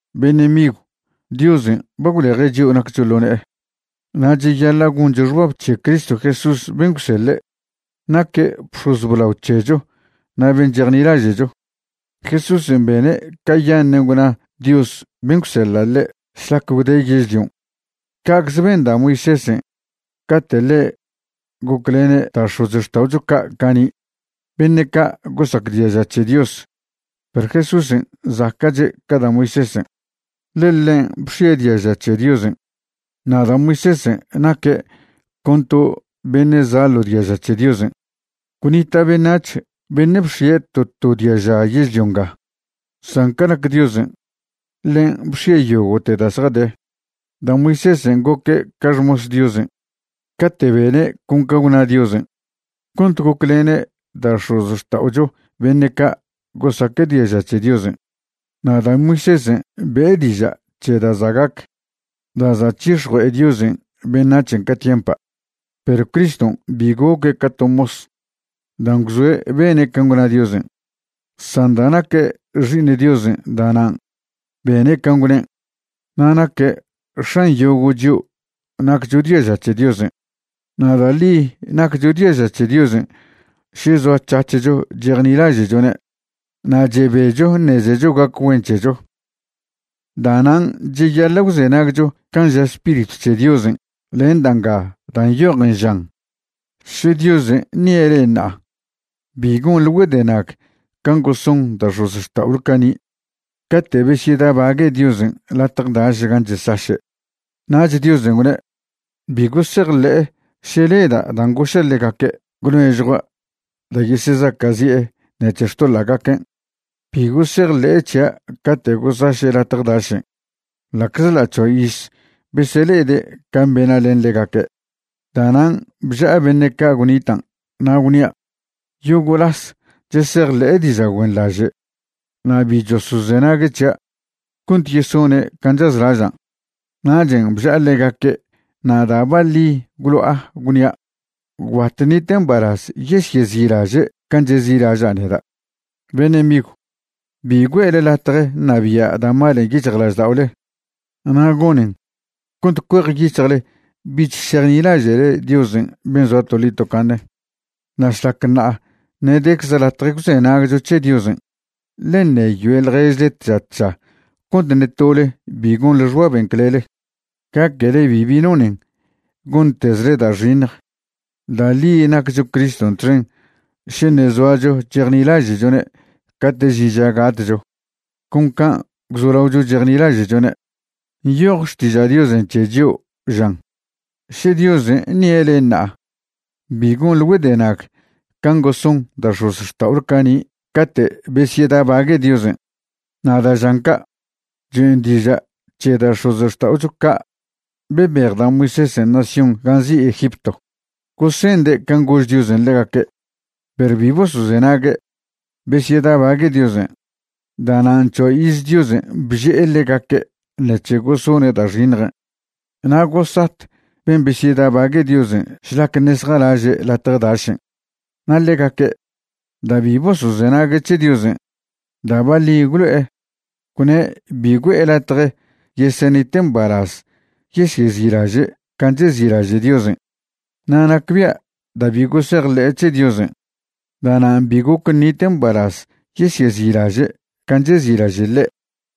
Beṉe' migw, Diosen' ba gwleje' chio' naccho ḻo ne'e, na' cheyaḻa' goncho xbab c̱he Cristo Jesús ben' gwseḻe'. Naque' bx̱oz blao c̱hecho na' ben' chejnilaže'cho. Jesúsen' bene' cayaṉen' gwna Dios ben' gwseḻa' ḻe' šlac gwde' yežlion', ca'cze ben da' Moisésen' cate' ḻe' goclene' da' x̱ozxta'ocho ca' cani', beṉe' ca' gosac diaža c̱he Dios. Perw Jesúsen' zaca'che' ca da' Moisésen', ḻe ḻen' bx̱ie' diaža c̱he Diosen', na' da' Moisésen' naque' con to beṉe' za' ḻo diaža c̱he Diosen'. Gwnita' beṉac̱h beṉe' bx̱ie' to to diaža yežlio nga, san ca nac Diosen', ḻen' bx̱ie' yogo'te da' zjade. Da' Moisésen' goque' ca xmos Diosen' cate' bene' con can' gwna Diosen' cont goclene' da' x̱ozxta'ocho beṉe' ca' gosaque' diaža c̱he Diosen'. Na' da' Moisésen' be'e diža' c̱he da' za' gac da' za' c̱hix̱jue'e Diosen' beṉac̱hen' ca tiempa'. Perw Criston' bi goque' ca to mos dan' gwzoe' bene' can' gwna Diosen', san da' naque' Xi'iṉ Diosen' da'nan' bene' can' gwnen', na' naque' X̱an yogo' chio' naccho diaža c̱he Diosen'. Na' da' ḻi naccho diaža c̱he Diosen' še zoac̱hac̱hcho chejnilaže'chone' na' chebecho ṉezecho gac güen c̱hecho. Da'nan' cheyaḻa' gwzenagcho can' ža Spiritw c̱he Diosen' len da' nga da' nyojen, žan: Še Diosen' ṉie' le'e ṉa'a, bi gonḻe güedenag can' goson da' x̱ozxta'ole cani' cate' besyedabague' Diosen' latje daš gan' chesaše'. Nach Diosen' gwne': Bi gosejḻe'e še leda' dan' goša' ḻegaque' gwnežjua' da' yesezaca'zi'e ṉec̱he xtoḻa'gaquen'. Bi gosejḻe'e c̱hia' cate' gosaše' latje dašen', ḻa'czḻa' c̱hoa iz besele'ede' can' bena' len ḻegaque'. Da'nan' bža'a beṉe' ca' gwnitan' na' gwnia': “Yogo' las chesejḻe'e diža' güenḻaže', na' bi chosozenague' c̱hia' cont yesone' can' chazlažan'.” Nachen' bža'a ḻegaque' na' da' baḻi gwlo'a gwnia': “Gwbat ṉite' mbalaz yesyezi'laže' can' chezi'laža' neda'.” Beṉe' migw, bi güe'le latje ṉabia' da' malen' yic̱hjlažda'ole na' gonen cont cuejyic̱hjle bich šejnilaže'le Diosen' ben' zoa toḻi tocaṉe. Na' šlac ṉa'a ṉe' decze latje gwzenagcho c̱he Diosen', ḻe ṉeyoe ḻježle tža tža cont ṉe tole bi gonḻe xbaben' clele, gaquele bibi nonen gontezle da' xiṉj. Da' ḻi naccho Criston' txen še ṉe' zoacho chejnilaže'chone' cate' žin ža gatcho, con can' gwzolaocho chejnilaže'chone'. Nyoj Xtiža' Diosen' c̱he chio', žan: Še Diosen' ṉie' le'e ṉa'a, bi gonḻe güedenag can' goson da' x̱ozxta'ole cani' cate' besyedabague' Diosen'. Na' da' žan ca', choen' diža' c̱he da' x̱ozxta'ocho ca' bebej da' Moisésen' nación gan' nzi' Egipto. Gosende' can' gož Diosen' ḻegaque', perw bi bosozenague', besyedabague' Diosen'. Da'nan' c̱hoa iz Diosen' bže'e ḻegaque' ṉec̱he gosone' da' xiṉjen', na' gosat ben' besyedabague' Diosen' šlac ṉe' zjalaže' latje dašen'. Na' ḻegaque', da' bi bosozenague' c̱he Diosen', da' baḻi gwlo'e, gwne' bi güe'e latje yesenite' mbalaz yesyezi'laže' can' chezi'laže' Diosen'. Na' nacbia' da' bi gosejḻe'e c̱he Diosen', da'nan' bi goc ṉite' mbalaz yesyezi'laže' can' chezi'laže' ḻe'.